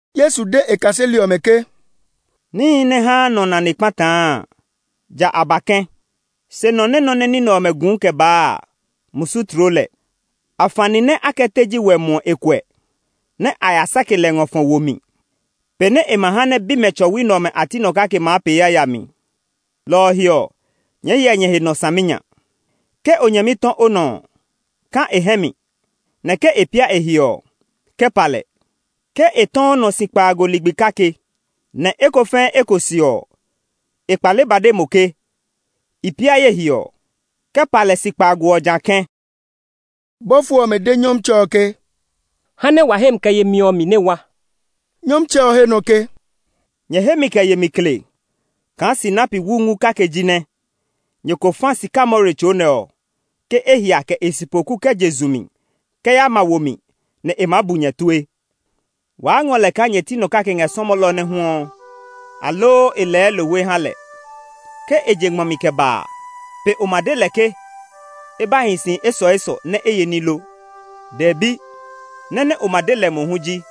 Yesu de e kaseli ɔmɛ ke, “Níhi nɛ haa nɔ nane kpataa a, ja a ba kɛ̃. Se nɔ nɛ nɔ nɛ ní nɛ ɔmɛ guu kɛ baa a, musu tloo lɛ! Afani nɛ a kɛ teji wɛ muɔ e kuɛ, nɛ a ya sake lɛ ngɔ fɔ wo mi pe nɛ e ma ha nɛ bimɛ tsɔwi nɛ ɔmɛ a ti nɔ kake maa pee yayami. Lɔ ɔ he ɔ, nyɛɛ hyɛ nyɛ he nɔ saminya! “Ke o nyɛmi tɔ o nɔ ɔ, kã e hɛ mi, nɛ ke e pia e he ɔ, kɛ pa lɛ. Ke e tɔ o nɔ si kpaago ligbi kake, nɛ eko fɛɛ eko se ɔ, e kpale ba de mo ke, ‘I pia ye he’ ɔ, kɛ pa lɛ si kpaago ɔ jã kɛ̃.” Bɔfo ɔmɛ de Nyɔmtsɛ ɔ ke, “Ha nɛ wa hemi kɛ yemi ɔ mi nɛ wa!” Nyɔmtsɛ ɔ he nɔ ke, “Nyɛ hemi kɛ yemi kle kaa sinapi wu ngu kake jinɛ nyɛ ko fa sikamore tso nɛ ɔ ke e hia kɛ e sipoku kɛ je zu mi kɛ ya ma wo mi, nɛ e maa bu nyɛ tue. “Waa ngɔ lɛ kaa nyɛ ti nɔ kake ngɛ sɔmɔlɔ nɛ huɔ, aloo e lɛɛ lohwe ha lɛ. Ke e je ngmɔ mi kɛ ba a, pe o ma de lɛ ke e ba hi si esɔesɔ nɛ e ye ní lo? Dɛbi, nɔ́ nɛ o ma de lɛ mohu ji,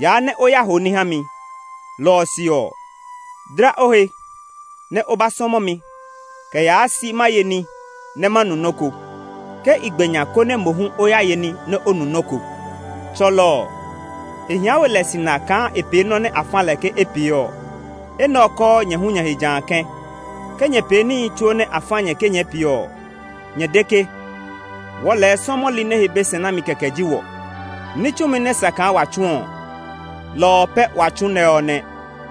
‘Yaa nɛ o ya hoo ní ha mi. Lɔ ɔ se ɔ, dla o he, nɛ o ba sɔmɔ mi kɛ yaa si ma ye ní nɛ ma nu nɔ́ ko. Ke i gbe nya, konɛ mo hu o ya ye ní nɛ o nu nɔ́ ko.’ Tsɔlɔ ɔ, e hia we lɛ sina kaa e pee nɔ́ nɛ a fa lɛ ke e pee ɔ. Enɛ ɔ kɔɔ nyɛ hu nyɛ he jã kɛ̃. Ke nyɛ pee níhi tsuo nɛ a fa nyɛ ke nyɛɛ pee ɔ, nyɛ de ke, ‘Wɔɔ lɛɛ sɔmɔli nɛ he be se nami kɛkɛ ji wɔ. Ní tsumi nɛ sa kaa wa tsu ɔ, lɔ ɔ pɛ wa tsu nɛ ɔ nɛ.’”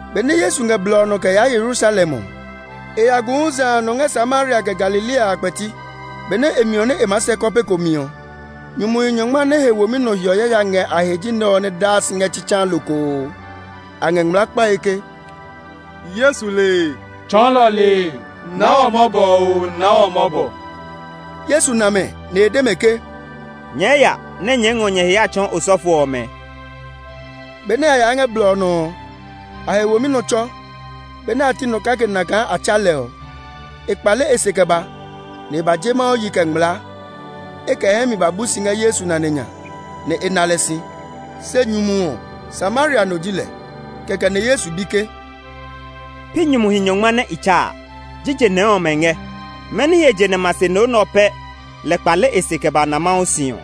Benɛ Yesu ngɛ blɔ ɔ nɔ kɛ yaa Yerusalem ɔ, e ya gu huza a nɔ ngɛ Samaria kɛ Galilea a kpɛti. Benɛ e miɔ nɛ e maa sɛ kɔpe ko mi ɔ, nyumuhi nyɔngma nɛ he womi nɔ hiɔ yaya ngɛ a he ji nɛ ɔ nɛ daa si ngɛ tsitsaa lokoo. A ngɛ ngmlaa kpae ke, “Yesu lee! Tsɔɔlɔ lee! Naa wɔ mɔbɔ oo, naa wɔ mɔbɔ!” Yesu na mɛ, nɛ e de mɛ ke, “Nyɛɛ ya nɛ nyɛɛ ngɔ nyɛ he ya tsɔɔ osɔfo ɔmɛ.” Benɛ a yaa ngɛ blɔ ɔ nɔ ɔ, a he womi nɔ tsɔ. Benɛ a ti nɔ kake na kaa a tsa lɛ ɔ, e kpale e se kɛ ba, nɛ e ba je Mawu yi kɛ ngmlaa. E kɛ e hɛ mi ba bu si ngɛ Yesu nane nya, nɛ e na lɛ si. Se nyumu ɔ, Samaria no ji lɛ. Kɛkɛ nɛ Yesu bi ke, “Pi nyumuhi nyɔngma nɛ i tsa a? Jije nɛɛ ɔmɛ ngɛ? Mɛni he je nɛ ma se no nɛ ɔ pɛ lɛ kpale e se kɛ ba na Mawu si ɔ?”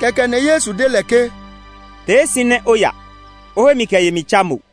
Kɛkɛ nɛ Yesu de lɛ ke, “Tee si nɛ o ya; o hemi kɛ yemi tsa mo.”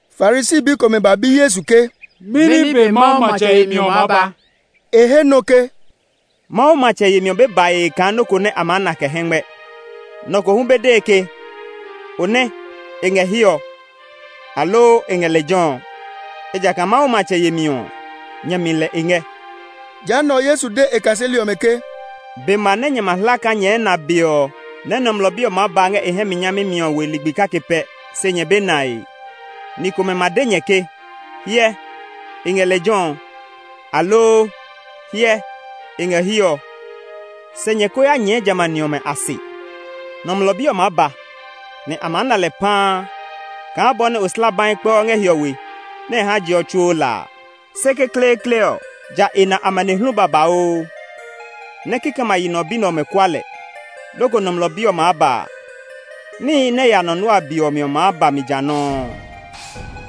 Farisi bi komɛ ba bi Yesu ke, “Mɛni be Mawu matsɛ yemi ɔ maa ba?” E he nɔ ke, “Mawu matsɛ yemi ɔ be bae kaa nɔ́ ko nɛ a maa na kɛ hɛngmɛ. Nɔ ko hu be dee ke, ‘O nɛ, e ngɛ hiɛ ɔ;’ aloo, ‘E ngɛ lejɛ ɔ’; ejakaa Mawu matsɛ yemi ɔ, nyɛ mi lɛ e ngɛ.” Jehanɛ ɔ, Yesu de e kaseli ɔmɛ ke, “Be ma nɛ nyɛ ma hla kaa nyɛɛ na be ɔ nɛ Nɔmlɔ Bi ɔ maa ba ngɛ e hɛ mi nyami mi ɔ we ligbi kake pɛ, se nyɛ be nae. Ni komɛ ma de nyɛ ke, ‘Hyɛ, e ngɛ lejɛ ɔ’, aloo, ‘Hyɛ, e ngɛ hiɛ ɔ!’ Se nyɛ ko ya nyɛɛ jamɛ a ni ɔmɛ a se. Nɔmlɔ Bi ɔ maa ba, nɛ a maa na lɛ paa kaa bɔ nɛ oslabai kpɛɔ ngɛ hiɔwe nɛ e haa je ɔ tsuo la a. Se kekleekle ɔ, ja e na amanehlu babauu, nɛ kikɛmɛ a yi nɔ bi nɛ ɔmɛ kua lɛ. Loko Nɔmlɔ Bi ɔ maa ba a, níhi nɛ ya nɔ Noa be ɔ mi ɔ maa ba mi jã nɔuu.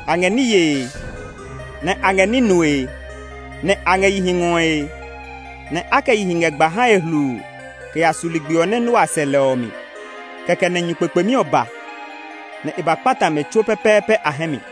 A ngɛ ní yee, nɛ a ngɛ ní nue; a ngɛ yihi ngɔe, nɛ a kɛ yihi ngɛ gba hae hluu kɛ ya su ligbi ɔ nɛ Noa sɛ lɛ ɔ mi. Kɛkɛ nɛ nyu kpekpemi ɔ ba, nɛ e ba kpata mɛ tsuo pɛpɛɛpɛ a hɛ mi.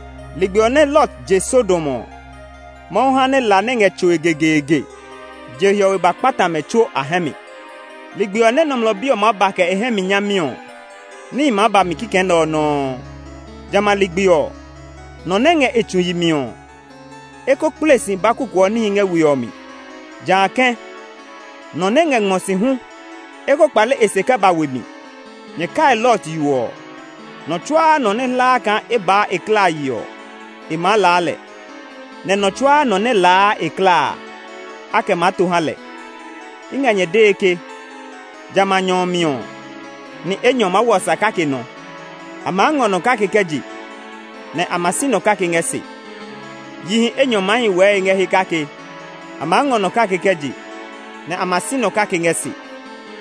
Ligbi ɔ nɛ Lot je Sodom ɔ, Mawu ha nɛ la nɛ ngɛ tsoe gegeege je hiɔwe ba kpata mɛ tsuo a hɛ mi. Ligbi ɔ nɛ Nɔmlɔ Bi ɔ hu maa ba kɛ e hɛ mi nyami ɔ, níhi maa ba mi kikɛ nɛ ɔ nɔuu. “Jamɛ a ligbi ɔ, nɔ nɛ ngɛ e tsu yi mi ɔ, e ko kple si ba kukuɔ níhi ngɛ we ɔ mi. Jã kɛ̃, nɔ nɛ ngɛ ngmɔ si hu e ko kpale e se kɛ ba we mi. Nyɛ kai Lot yo ɔ! Nɔ tsuaa nɔ nɛ hlaa kaa e baa e klaa yi ɔ, e maa laa lɛ; nɛ nɔ tsuaa nɔ nɛ laa e klaa a, a kɛ maa to ha lɛ. I ngɛ nyɛ dee ke, jamɛ a nyɔ ɔ mi ɔ, ni enyɔ maa hwɔ sa kake nɔ; a maa ngɔ nɔ kake kɛ je, nɛ a ma si nɔ kake ngɛ se. Yihi enyɔ maa hi nɔ́ wɛɛe ngɛ he kake; a maa ngɔ nɔ kake kɛ je, nɛ a ma si nɔ kake ngɛ se. [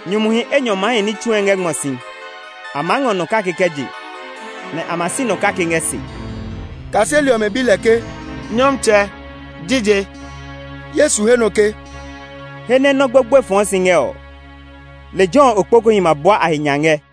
“Nyumuhi enyɔ maa hi ní tsue ngɛ ngmɔ si; a maa ngɔ nɔ kake kɛ je, nɛ a ma si nɔ kake ngɛ se.”] Kaseli ɔmɛ bi lɛ ke, “Nyɔmtsɛ, jije?” Yesu he nɔ ke, “He nɛ nɔ́ gbogboe fɔɔ si ngɛ ɔ, lejɛ ɔ okpokuhi ma bua a he nya ngɛ.”